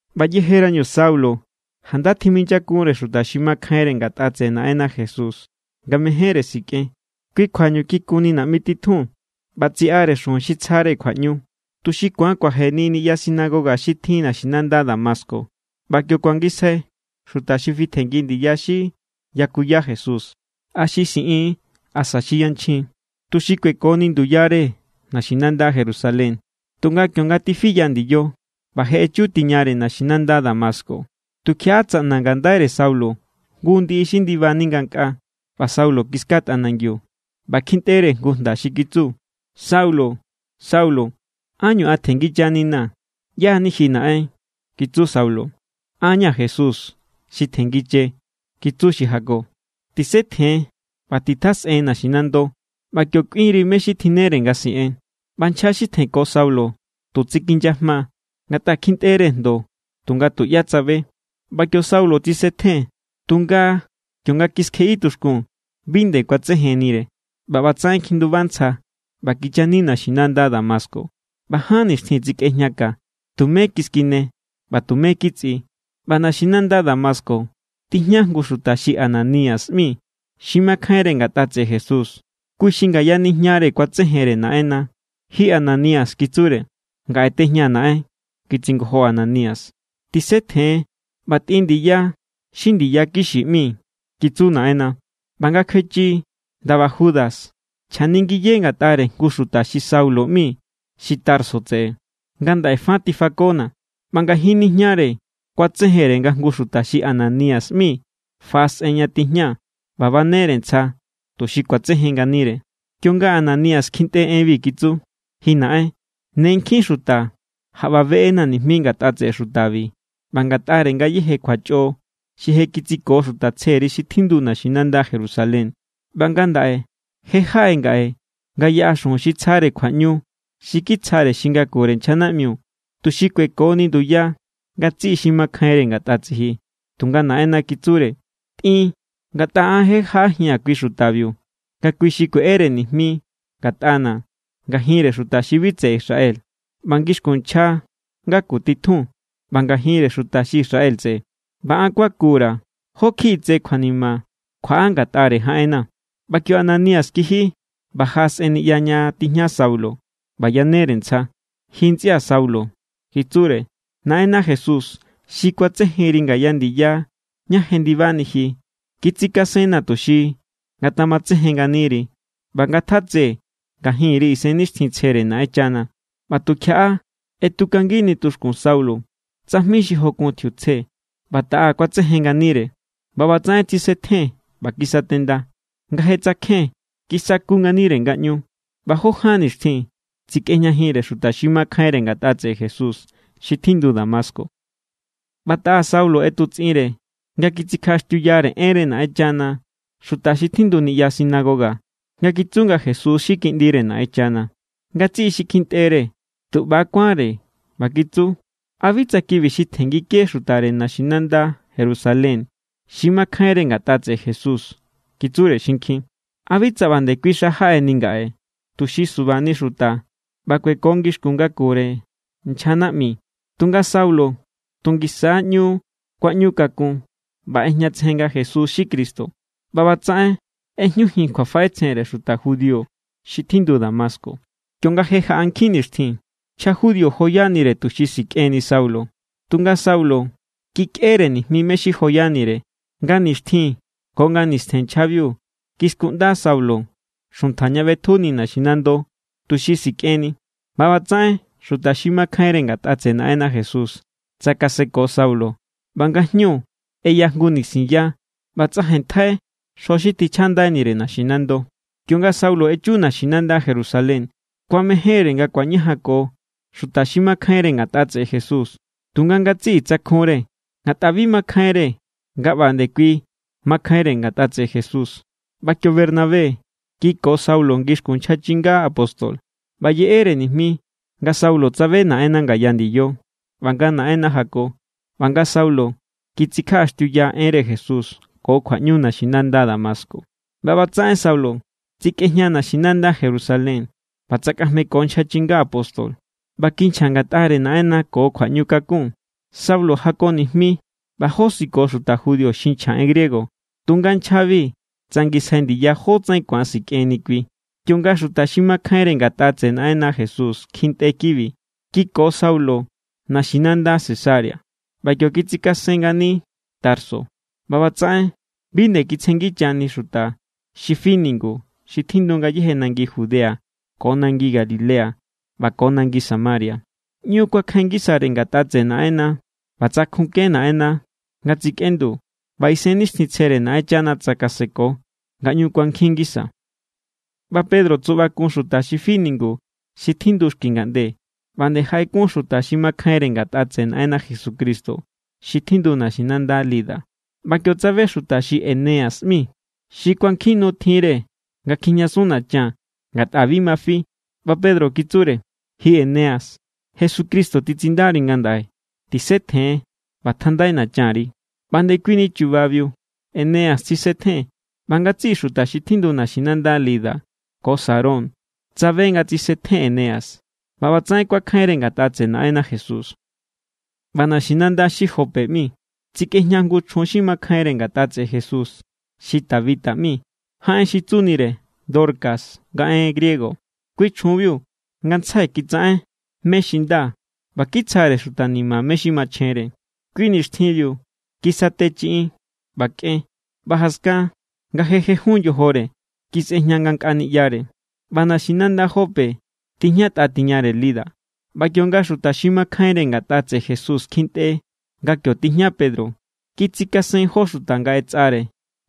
ꞌBa yejerañu Saulo, janda tjiminyakunre xuta xi makjainre ngatꞌa tseꞌe Naꞌenna Jesús nga mejénre sikꞌen. Kui kjuañu kikunni naꞌmi titjun ꞌba tsiꞌare xujun xi tsjare kjuaꞌñu, tuxi ku̱an kuajeni niꞌya sinagoga xi tjin naxinanda Damasco ꞌba kio kuangisjai xuta xi fitjenngi ndiya xi yakuya Jesús, a xi xiꞌin= asa xi yanchjin, tuxi kuekoni nduyare naxinanda Jerusalén. Tunga kionga tifiya ndiyo ꞌba je echutiñare naxinanda Damasco, tukjiaꞌa tsaꞌna ngandaire Saulo jngu ndiꞌi xi ndibani ngankꞌaa. ꞌBa Saulo kiska tꞌanangiu ꞌba kjintꞌere jngu jnda xi kitsu: —Saulo, Saulo, ¿ánñu an tjenngichaninaa̱? —¿ꞌYá= ni ji, Naꞌen? —kitsu Saulo. —An= ña̱ Jesús xi tjenngiche —kitsu xi jako—. Tisetjen ꞌba titjasꞌen naxinando. ꞌBa kio kꞌuinri mé= xi tjinnere nga siꞌen. ꞌBa nchja xi tjenko Saulo tu tsikinyajma, ngatꞌa kjintꞌere jndo tunga tuꞌyá tsabe. ꞌBa kio Saulo tsisetjen, tunga kionga kiskjeꞌi tuxkun bi nde kuatsejennire. ꞌBa ꞌbatsaꞌen kjinduba ntsja ꞌba kichani naxinanda Damasco. ꞌBa ján nixtjin tsikꞌejña ka. Tumé kiskine ꞌba tumé kitsꞌi. ꞌBa naxinanda Damasco tijña jngu xuta xi Ananías ꞌmi, xi makjainre ngatꞌa tseꞌe Jesús. Kui xi ngaya nijñare kuatsejenre Naꞌenna. —¡Ji Ananías! —kitsure. —Ngaꞌe tejñaa̱, Naꞌen —kitsingojo Ananías. —Tisetjen ꞌba tꞌin ndiya xi Ndiya Kixi ꞌmi —kitsu Naꞌenna—. ꞌBa nga kjuechi ndaba Judas, chjaningiye ngatꞌare jngu xuta xi Saulo ꞌmi xi Tarso tseꞌe. Ngandaꞌe fa tifakona̱. ꞌBa ngajin nijñare kuatsejenre nga jngu xuta xi Ananías ꞌmi faꞌasꞌen ña tijña ꞌba banere ntsja tuxi ku̱atsejen nganire. Kionga Ananías kjintꞌe enbi, kitsu: —Ji Naꞌen, ne nkjin xuta jaꞌba beꞌena̱ nijmi ngatꞌa tseꞌe xutabi ꞌba ngatꞌare ngayéje kjuachꞌo xi je kitsiko xuta tsjeri xi tjindu naxinanda Jerusalén. ꞌBa ngandaꞌe je jaꞌe ngaꞌe nga yaꞌa xujun xi tsjare kjuaꞌñu xi kitsjare xi ngakure nchja naꞌmi, tuxi kuekoni nduya ngatsiꞌi xi makjainre ngatꞌa tsiji. Tunga Naꞌenna kitsure: —Tꞌin. Ngatꞌa an je jaꞌajia̱n kui xutabiu nga kui xi kueꞌere nijmi ngatꞌana̱ ngajinre xuta xi bi tseꞌe Israel ꞌba ngixkun nchja ngaku titjun ꞌba ngajinre xuta xi Israel tseꞌe. ꞌBa an kuaku_ra̱ jó kjiꞌi tse kjuanima kjuaꞌa ngatꞌare jaꞌenna̱. ꞌBa kio Ananías kiji ꞌba jaꞌasꞌen niꞌya ña tijña Saulo ꞌba yanere ntsja. —Ji ntsꞌia̱ Saulo —kitsure—, Naꞌenna Jesús xi kuatsejenri ngaya ndiya ñá jendibani ji, kitsikasenna̱ tuxi ngatamatsejen nganiri ꞌba nga ngatjatse ngajinri Isennixtjintsjere Naꞌenchana. ꞌBa tukjiaꞌa ꞌetukangini tuxkun Saulo tsajmi xi jokun tjiutsje, ꞌba taꞌa kuatsejen nganire. ꞌBa ꞌbatsaꞌen tsisetjen= ꞌba kisatenda. Nga je tsakjen, kisaku nganire ngaꞌñu, ꞌba jó ján nixtjin tsikꞌejñajinre xuta xi makjainre ngatꞌa tseꞌe Jesús xi tjindu Damasco. ꞌBa taꞌa Saulo ꞌetutsꞌinre nga kitsikjaꞌaxtiuyare enre Naꞌenchana xuta xi tjindu niꞌya sinagoga nga kitsu nga Jesús= xi Kiꞌndire Naꞌenchana. Ngatsiꞌi xi kjintꞌere tu ꞌba= kuánre ꞌba kitsu: —¿A bi tsa kibi xi tjenngike xutare naxinanda Jerusalén xi makjainre ngatꞌa tseꞌe Jesús? —kitsure xinkjin—. ¿A bi tsa ꞌba nde kui xa jaꞌeni ngaꞌe, tuxi subani xuta ꞌba kuekoni ngixkun ngakure nchja nijmi? Tunga Saulo tu ngisa= ꞌñu kuaꞌñukakun ꞌba ꞌejñatsejen nga Jesús= xi Cristo. ꞌBa ꞌbatsaꞌen ꞌejñujin kjuafaꞌetsjenre xuta judío xi tjindu Damasco. Kionga je jaꞌa nkjin nixtjin, nchja judío joyanire tuxi sikꞌenni Saulo. Tunga Saulo kikꞌere nijmi mé= xi joyanire. Nga nixtjin ko nga nistjen nchjabiu kiskunꞌnda Saulo xuntja ña ꞌbetjuni naxinando, tuxi sikꞌenni. ꞌBa ꞌbatsaꞌen xuta xi makjainre ngatꞌa tseꞌe Naꞌenna Jesús tsakaseko Saulo. ꞌBa ngajñu ꞌeya jngu nisinya ꞌba tsꞌajenntjai xjo xi tjinchꞌandainire naxinando. Kionga Saulo echu naxinanda Jerusalén, kuamejénre nga kuañajanko xuta xi makjainre ngatꞌa tseꞌe Jesús. Tunga ngatsiꞌi tsakjunre, ngatꞌa bi makjainre nga ꞌba nde kui makjainre ngatꞌa tseꞌe Jesús. ꞌBa kio Bernabé kiko Saulo ngixkun nchja chinga apóstol ꞌba yeꞌere nijmi nga Saulo tsabe Naꞌenna ngaya ndiyo, ꞌba nga Naꞌenna jako, ꞌba nga Saulo kitsikjaꞌaxtiuya enre Jesús ko kjuaꞌñu naxinanda Damasco. ꞌBa ꞌbatsaꞌen Saulo tsikꞌejña naxinanda Jerusalén ꞌba tsakꞌajmeko nchja chinga apóstol. ꞌBa kinchja ngatꞌare Naꞌenna ko kjuaꞌñukakun. Saulo jako nijmi ꞌba josiko xuta judío xi nchja en griego. Tunga nchjabi tsangisjai ndiya jótsaꞌen ku̱an sikꞌenni kui. Kionga xuta xi makjainre ngatꞌa tseꞌe Naꞌenna Jesús kjintꞌe kibi, kiko Saulo naxinanda Cesarea ꞌba kio kitsikasen ngani Tarso. ꞌBa ꞌbatsaꞌen bi nde kitsjenngichani xuta xi fi ningu xi tjindu ngayéje nangi Judea ko nangi Galilea ꞌba ko nangi Samaria. ꞌÑu kuakjain ngisare ngatꞌa tseꞌe Naꞌenna ꞌba tsakjunke Naꞌenna nga tsikꞌendu, ꞌba Isennixtjintsjere Naꞌenchana tsakaseko nga ꞌñu kuankjin ngisa. ꞌBa Pedro tsuꞌbakun xuta xi fi ningu xi tjindu xki ngaꞌnde, ꞌba nde jaꞌekun xuta xi makjainre ngatꞌa tseꞌe Naꞌenna Jesucristo xi tjindu naxinanda Lida. ꞌBa kio tsabe jngu xuta xi Eneas ꞌmi, xi kuajin nu tjinre nga kjijñasun nachan, ngatꞌa bi ma fi. ꞌBa Pedro kitsure: —Ji Eneas, Jesucristo titsindari ngandaꞌe. Tisetjen ꞌba tjandai nachanri. ꞌBa ndekuini chubabiu Eneas tsisetjen. ꞌBa ngatsiꞌi xuta xi tjindu naxinanda Lida ko Sarón tsabe nga tsisetjen Eneas ꞌba ꞌbatsaꞌen kuakjainre ngatꞌa tseꞌe Naꞌenna Jesús. ꞌBa naxinanda xi Jope ꞌmi tsikꞌejña jngu chjun xi makjainre ngatꞌa tseꞌe Jesús xi Tabita ꞌmi, jaꞌen xi tsunire Dorcas nga en griego. Kui chjunbiu ngantsjai kitsaꞌen mé= xi nda ꞌba kitsjare xuta ni̱ma̱ mé= xi machjenre. Kui nixtjinbiu kisate chiꞌin ꞌba kꞌen, ꞌba jaskan nga je jejun yojore, kisꞌejña ngankꞌa niꞌyare. ꞌBa naxinanda Jope tijñatꞌa tiñare Lida, ꞌba kionga xuta xi makjainre ngatꞌa tseꞌe Jesús kjintꞌe nga kio tijña Pedro, kitsikasen jó xuta nga ꞌetsꞌare: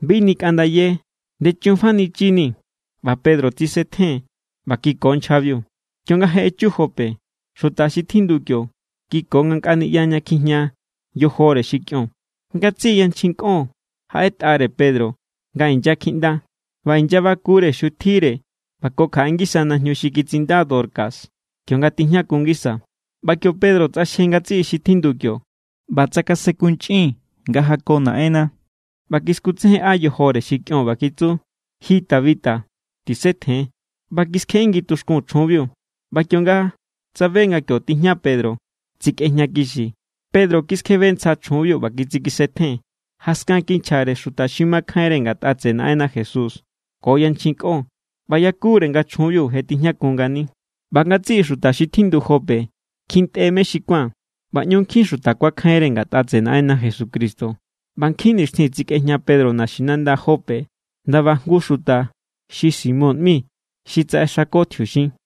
—Bi nikꞌandaye. Ndechunfanichinii̱. ꞌBa Pedro tsisetjen ꞌba kiko nchjabiu. Kionga je echu Jope, xuta xi tjindu kio kiko ngankꞌa niꞌya ña kjijña yojore xi kꞌion. Ngatsiꞌi yanchjin kꞌon jaꞌetꞌare Pedro nga inyakjiꞌnda ꞌba inyabakure xutjire ꞌba ko kjaꞌe ngisa najñu xi kitsinda Dorcas kionga tijñakun ngisa. ꞌBa kio Pedro tsꞌaxje ngatsiꞌi xi tjindu kio, ꞌba tsakasenkunchꞌin nga jako Naꞌenna, ꞌba kiskutsejenꞌa yojore xi kꞌion ꞌba kitsu: —Ji Tabita, tisetjen. ꞌBa kiskjeꞌingi tuxkun chjunbiu, ꞌba kionga tsabe nga kio tijña Pedro, tsikꞌejñakixi. Pedro kiskjebe ntsja chjunbiu ꞌba kitsikisetjen. Jaskan kinchjare xuta xi makjainre ngatꞌa tseꞌe Naꞌenna Jesús ko yanchjin kꞌon, ꞌba yakure nga chjunbiu je tijñakun ngani. ꞌBa ngatsiꞌi xuta xi tjindu Jope kjintꞌe mé xi kuán ꞌba ꞌñu nkjin xuta kuakjainre ngatꞌa tseꞌe Naꞌenna Jesucristo. ꞌBa nkjin nixtjin tsikꞌejña Pedro naxinanda Jope, ndaba jngu xuta xi Simón ꞌmi xi tsaꞌexako tjiuxin.